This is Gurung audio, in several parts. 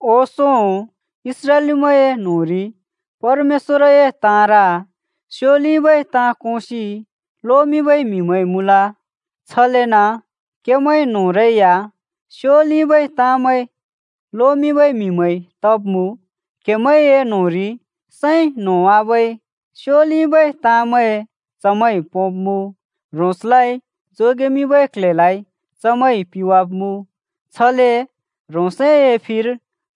ओंसों इस्राएलीमैंए न्‍होंरि परमेश्‍वरए ताँर स्योलिबै ताँ कोंसि लोमिंबै म्हिमैं मुँल। छलेन क्हेमैं न्होंरै या स्योलिबै ताँमैं लोमिंबै म्हिमैं तब्मुँ। क्हेमैंए न्होंरि सैं न्होंवाबै स्योलिबै ताँमैं चमैंइ पोंब्मुँ, ह्रोंसलाइ जोगेमिंबै क्ल्हेलाइ चमैंइ पिवाब्मुँ। छले ह्रोंसए फिर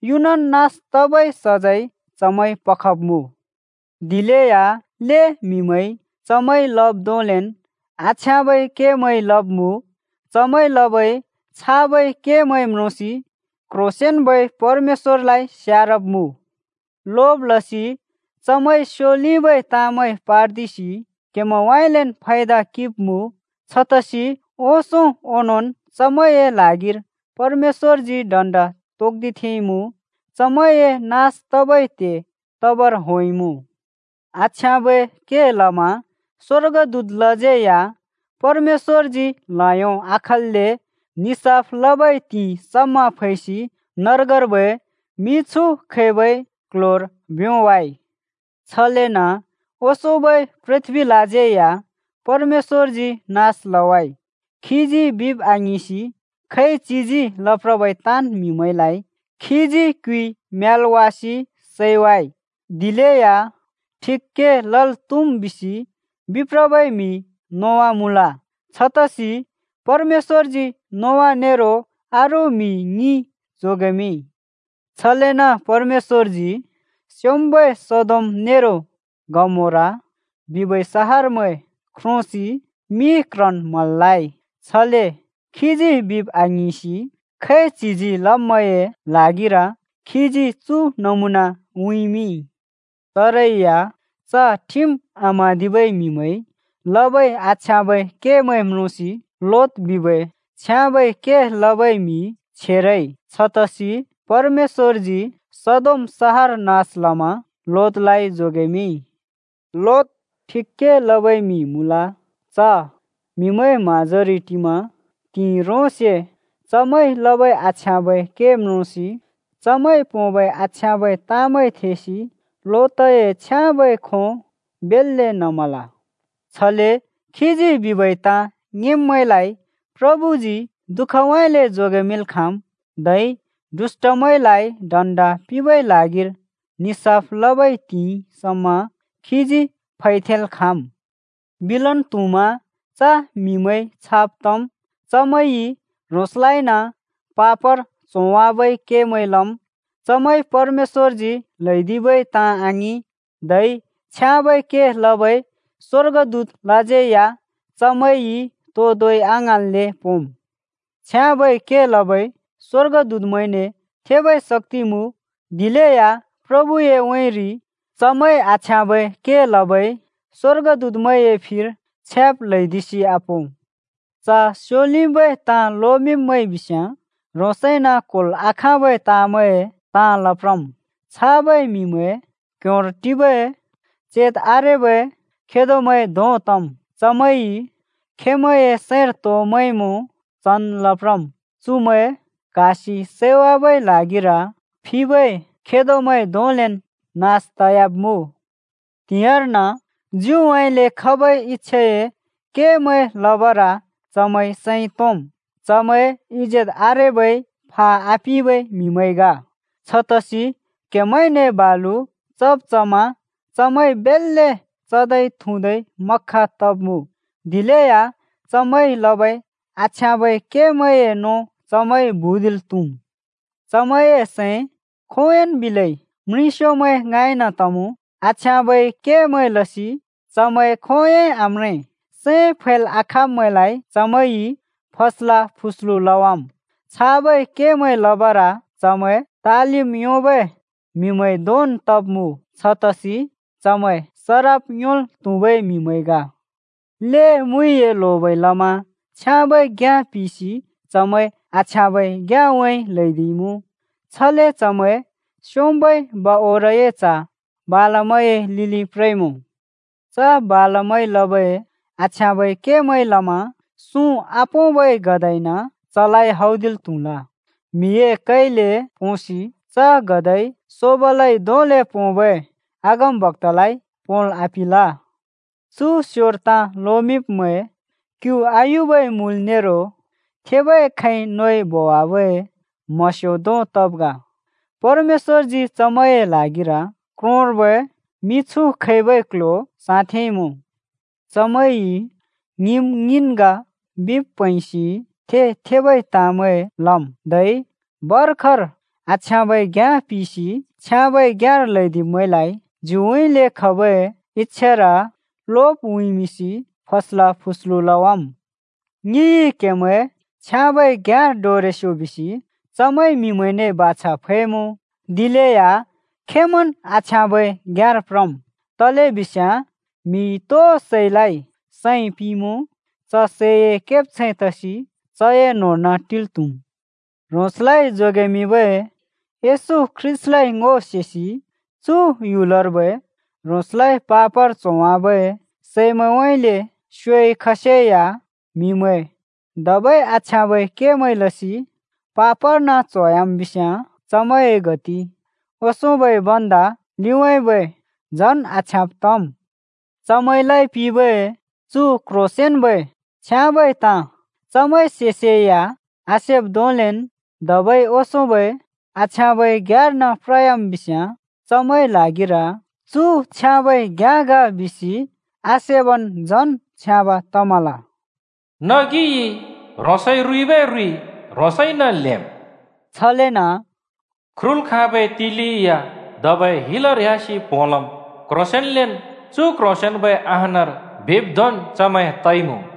युनन् नास तबै सजैं चमैंइ पखब्मुँ। दिलेया ल्‍हें म्‍हिमैंइ चमैंइ लब् धोंलेन् आछ्याँबै केमैं लब्मुँ। चमैंइ लबै छाबै केमैं म्रोंसि क्ह्रोंसेंन्बै परमेश्‍वरलाइ स्यारब्मुँ। लोब लसि चमैंइ स्योलिबै ताँमैं पार्दिसि क्‍हेमैंउँइँलेन् फायदा किंब्‍मुँ। छतसि ओंसों ओनोंन् चमैंए ल्हागिर परमेश्‍वरजी दण्‍ड तोक्दिथेंइमुँ। चमैंए नास तबै त्हे तबर होंइमुँ। आछ्याँबै के लमा स्‍वर्गदूतलाज्यै या परमेश्‍वरजी ल्हयो आखल्‍ले निसाफ लबै त्हिंइ समा फैसि नर्गर्बै मिछु खबै क्ल्ह्‍योर भ्योंवाइ। छलेन ओंसोंबै पृथ्बीलाज्यै या परमेश्‍वरजी नास लवाइ, खीजी बिब् आङिंसि खैच्हिजी लप्रबै ताँन् म्हिमैंलाइ खीजी क्‍युइ म्‍यालवासि सैवाइ। दिलेया ठिक के लल् त्हुम् बिसि बिप्रबै म्हि नोआ मुँल। छतसि परमेश्‍वरजी नोआ नेरो अरू म्हि ङि जोगेमिंइ। छलेन परमेश्‍वरजी स्‍योंम्‍बै सदोम नेरो गमोरा बिबै सहरमैं ख्रोंसि मि क्ह्रन् म्हलाइ। छले खीजी बिब् आङिंसि खैच्हिजी लब्मैंए ल्हागिर खीजी चु नमुना उँइँमिंइ। चरै या च ठिम आम्हाँदिबै म्हिमैंइ लबै आछ्याँबै केमैं म्रोंसि लोत बिबै छ्याँबै के लबै म्हि छेरइ। छतसि परमेश्‍वरजी सदोम सहर नास लमा लोतलाइ जोगेमिंइ। लोत ठिक के लबै म्‍हि मुँल। च म्‍हिमैंए म्‍हाँजोरि टिमा त्हिंइ ह्रोंसे चमैंइ लबै आछ्याँबै के म्रोंसि, चमैंइ पोंबै आछ्याँबै ताँमैं थेसि लोतए छ्याँबै खों बेल्‍ले नमल। छले खीजी बिबै ताँ ङिंब्मैंलाइ प्रभुजी दुःखउँइँले जोगेमिंल् खाँम्, धै दुष्‍टमैंलाइ दण्ड पिंबै ल्हागिर निसाफ लबै त्हिंइ समा खीजी फैथेंल् खाँम्। बिलन् त्हुमा च म्हिमैं छाब् तम्: चमैंइ ह्रोंसलाइन पापर च्होवाबै केमैं लम्। चमैंइ परमेश्‍वरजी ल्हैदिबै ताँ आङिं। धै छ्याँबै के लबै स्वर्गदूतमैंलाज्यै या चमैंइ तो धोंइ आङ्हाँन्ले पोंम्। छ्याँबै के लबै स्‍वर्गदूतमैंने थेबै शक्ति मुँ, दिलेया प्रभुए उँइँरि चमैंइ आछ्याँबै के लबै स्वर्गदूतमैंए फिर छ्याब् ल्हैदिसि आपों। च स्‍योलिबै ताँ लोमिंब्‍मैं बिस्‍याँ ह्रोंसइन क्होल् आखाँबै ताँमैंए ताँ लप्रम्। छाबै म्हिमैं क्ह्‍योंर टिबै चेत आरेबै खेदोमैं धों तम्। चमैंइ खेंमैंए सैंर तो मैंमुँ चन् लप्रम्। चुमैं क्‍हासि सैवाबै ल्हागिर फिबै खेदोमैं धोंलेन् नास तयाब्मुँ। त्‍हिंयाँर्न ज्युउँइँले खबै इच्छाए केमैं लबर चमैं सैं तोंम्। चमैं इजेत आरेबै फा आपिबै म्हिमैं ग। छतसि क्‍हेमैंने बालु चब् चमा चमैं बेल्‍ले चदै थुँदै मख्ख तब्मुँ। दिलेया चमैंइ लबै आछ्याँबै केमैंए नों चमैंइ भुँदिल् त्‍हुम्। चमैंए सैं खोंयोंन् बिलै म्रिंस्योमैं ङाँइन तमुँ। आछ्याँबै केमैं लसि चमैं खोंयोंइ आम्रें, सैं फैल् आखाँब्मैंलाइ चमैंइ फस्ला फुस्लु लवाम्, छाबै केमैं लबर चमैं तालिम् योंबै म्हिमैं धोंन् तब् मुँ, छतसि चमैं सराप योंल् त्हुबै म्हिमैं ग। ल्हें मुइए लोबइ लमा छ्याँबै घ्‍याँ पिसि चमैं आछ्याँबै घ्‍याँउँइँ ल्‍हैदिइमुँ। छले चमैं स्‍योंम्‍बै बओरए च्‍ह बालामए लिलि प्रइमुँ। च बालामइ लबै आछ्याँबै केमैंइ लमा सुँ आपोंबै गधाइन चलाइ हौदिल् त्हुल। म्‍हिए कैले पोंसि च गधाइ सोबलइ धोंले पोंबै अगमबक्‍तालाइ पोंल् आपिंल। चु स्‍योर ताँ लोमिंब्‍मैं क्‍यु आयुबै मुल नेरो थेबै खैंइ नोइ बोवाबै म्हस्यो धों तब् ग। परमेश्‍वरजी चमैंए ल्हागिर क्रोंर्बै मिछु खैबै क्‍ल्‍ह्‍यो साँथेंइमुँ। चमैंइ ङिम् ङिन् ग बिब् प्हैंसि थे-थेबै ताँमैं लम्, धै भर्खर आछ्याँबै घ्याँ पिसि छ्याँबै घ्याँर ल्हैदिब्मैंलाइ ज्युउँइँले खबै इच्‍छार लोब उँइँमिंसि फस्ला फस्लु लवाम्। ङिइ क्हेमैं छ्याँबै घ्याँर डोरेस्यो बिसि चमैंइ म्हिमैंने बाछा फैमुँ, दिलेया खेंमैंन् आछ्याँबै घ्याँर प्रम्। तलेबिस्याँ म्‍हिइ तो सैलाइ सैं पिंमुँ, च सैए केब्छैं तसि चए न्होंर्न टिल् त्हुम्। ह्रोंसलाइ जोगेमिंबै येशू ख्रीष्‍टलाइ ङो सेसि चु ह्‍युलर्बै ह्रोंसलाइ पापर च्होवाबै सैमैंउँइँले स्योइ खसेया म्हिमैं धबै आछ्याँबै केमैं लसि पापर्न च्होयाम् बिस्याँ चमैंए गति ओंसोंबै भन्दा लिउँइँबै झन् आछ्याँब् तम्। चमैंलाइ पिंबै चु क्ह्रोंसेंन्बै छ्याँबै ताँ चमैंइ सेसेया आसेब् धोंलेन् धबै ओंसोंबै आछ्याँबै घ्याँर्न प्रयाम् बिस्याँ, चमैंए ल्हागिर चु छ्याँबै घ्याँ ग बिसि आसेबन् झन् छ्याँब तमल। “नगिइ ह्रोंसइ रूइबै रुइ ह्रोंसइन ल्हेंम्।” छलेन “ख्रुल् खाँबै तिलि या धबै हिलर ह्‍यासिन् प्होलम्। क्ह्रोंसेंन्लेन् चु क्ह्रोंसेंन्बै अहानर बिब् धोंन् चमैं तइमुँ।”